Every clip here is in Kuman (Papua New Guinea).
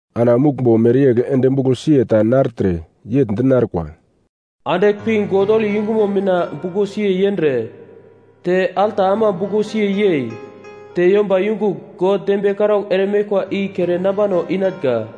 Ana muglmbo mereyegl ende buglo siye ta nartre, yegl di narkwa, “Andigl pi God holi yungumo mina buglo siye yendre, te alta ama buglo siye yei, te yomba yungugl God dembiye karaugl ere meglkwa i kere nambano inatnga.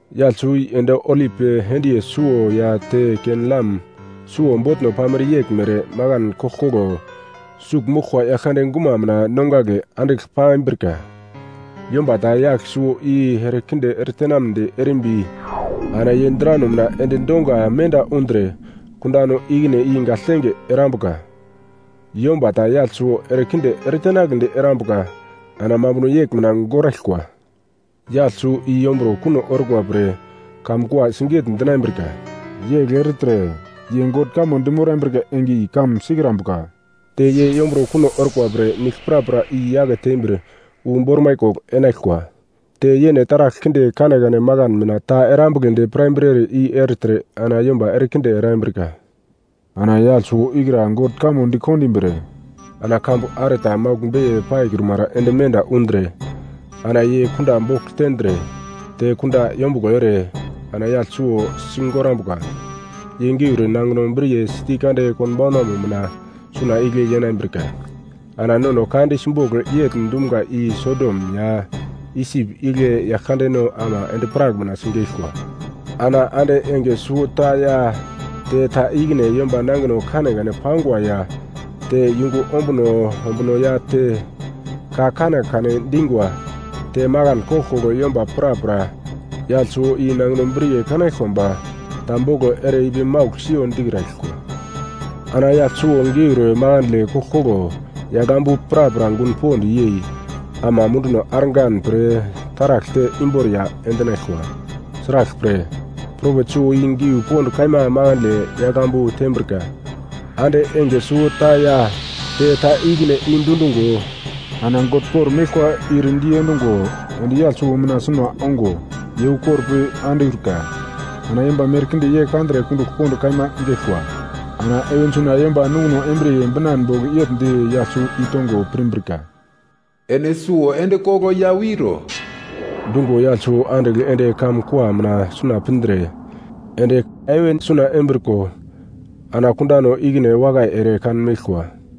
Yagl suwo i endi olip endiye suwo ya te ken-lam suwo botno pamere yeglmere makan koglkoglo sugl moglkwa Yaglkande guma mina nongagle andigl pambrika. Yomba ta yagl suwo i erekinde eretenamnedi erimbi ana ye drano mina endi donga menda undre kundano ikine i gagltenge erambuka. Yomba ta yagl suwo erekinde eretenagledi erambuka ana mambuno yegl mina goraglkwa. Yagl suwo i yomburo kuno orkwa pre kamun kua siget-dinambrika. Yegl ertre ye God kamo dimorambrika enge i kamun sikrambuka. Te ye yomburo kuno orkwa pre nigl prapra i-yake tembir wu bormai kogl enaglkwa. Te yene taragl kinde kanekane makan mina ta erambugledi pirambrere i ertre ana yomba erekinde erambrika. Ana yagl suwo ikra God kamo di kondimbir, ana kambu are ta maugl beiye paikrumara ende menda undre ana ye kunda bogl tendre, te kunda yombuglo ere, ana yagl suwo sigorambuka. Ye geur nangino briye siti kande konbaunanmo mina suna igle yenambirka. Ana nono ka di simbogl yegl dumga i Sodom ya Isip igle Yaglkandeno ama endi-prak mina sigeglkwa. Ana ande enge suwota ya te ta ikine yomba nangino kanekane pangwa ya te yungu ombuno ombuno ya te ka kanekane dingwa, te makan koglkoglo yomba prapra yagl suwo i nangino briye kanaglkwa ba ta boglo ere ipi maugl siyo dikraglkwa. Ana yagl suwo geur makandle koglkoglo yagl ambu prapra gun pond yei, ama munduno argan pre taragl te imboriya endinaglkwa. Sraglpre, propet suwo i giu pond kaima makandle yagl ambu tembrika. Ande enge suwota ya te ta ikine i dundungo, ana God kor-meglkwa ir diendungo ende yagl suwo mina suna ongo ye ukor pi andiurka, ana yomba merkinde ye kandre kundugl pond kaima geglkwa. Ana heven suna yomba nungo embriye binan bogl yegl di yagl suwo i tongo pirmbrika, “Ene suwo ende koglo ya wiro.” Dungo yagl suwo andigl ende kamun kua mina suna pindre ende heven suna embriko, ana kundano ikine wakai ere kanmeglkwa.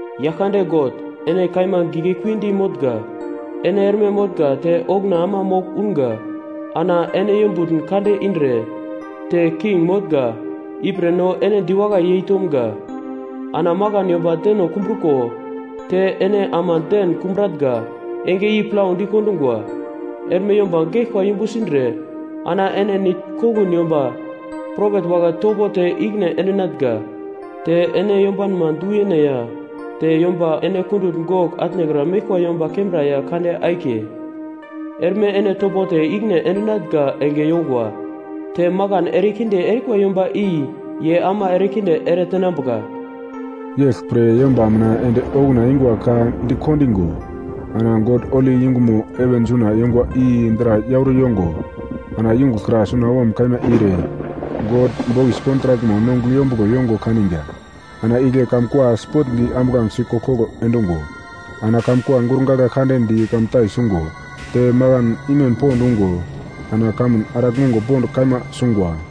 “Yaglkande God ene kaima giglekuidi motnga, ene erme motnga te okuna ama mogl unga, ana ene yombutn kande indre, te king motnga. Ipre no ene diwakai yeitomga. Ana makan yomba deno kumbruko te ene ama den kumbratnga enge i plau dikondungwa, erme yomba geglkwa yumbu sindre, ana ene nitn kongun yomba propet wagle topo te ikine endinatnga. Te ene yombanma du-yene ya te yomba ene kundutn gogl atnekra meglkwa yomba kembra ya kande akiye, erme ene topo te ikine endinatnga enge yongwa. Te makan erekinde erikwa yomba i ye ama erekinde eretenambuka!” Yeglpre yomba mina ende okuna engwa ka dikondigo, ana God holi yungumo heven suna yongwa i dra yauro yongo, ana yungugl kra sunawom kaima ire God bokis kontrakmo nongugl yombuglo yongo kanigwa. Ana igle kamun kua sipotndi ambuglangesi koglkoglo endungo, ana kamun gurgagla kande di kamuntai sungo, te makan imem pond ungo, ana kamun araglmongo pond kaima sungwa.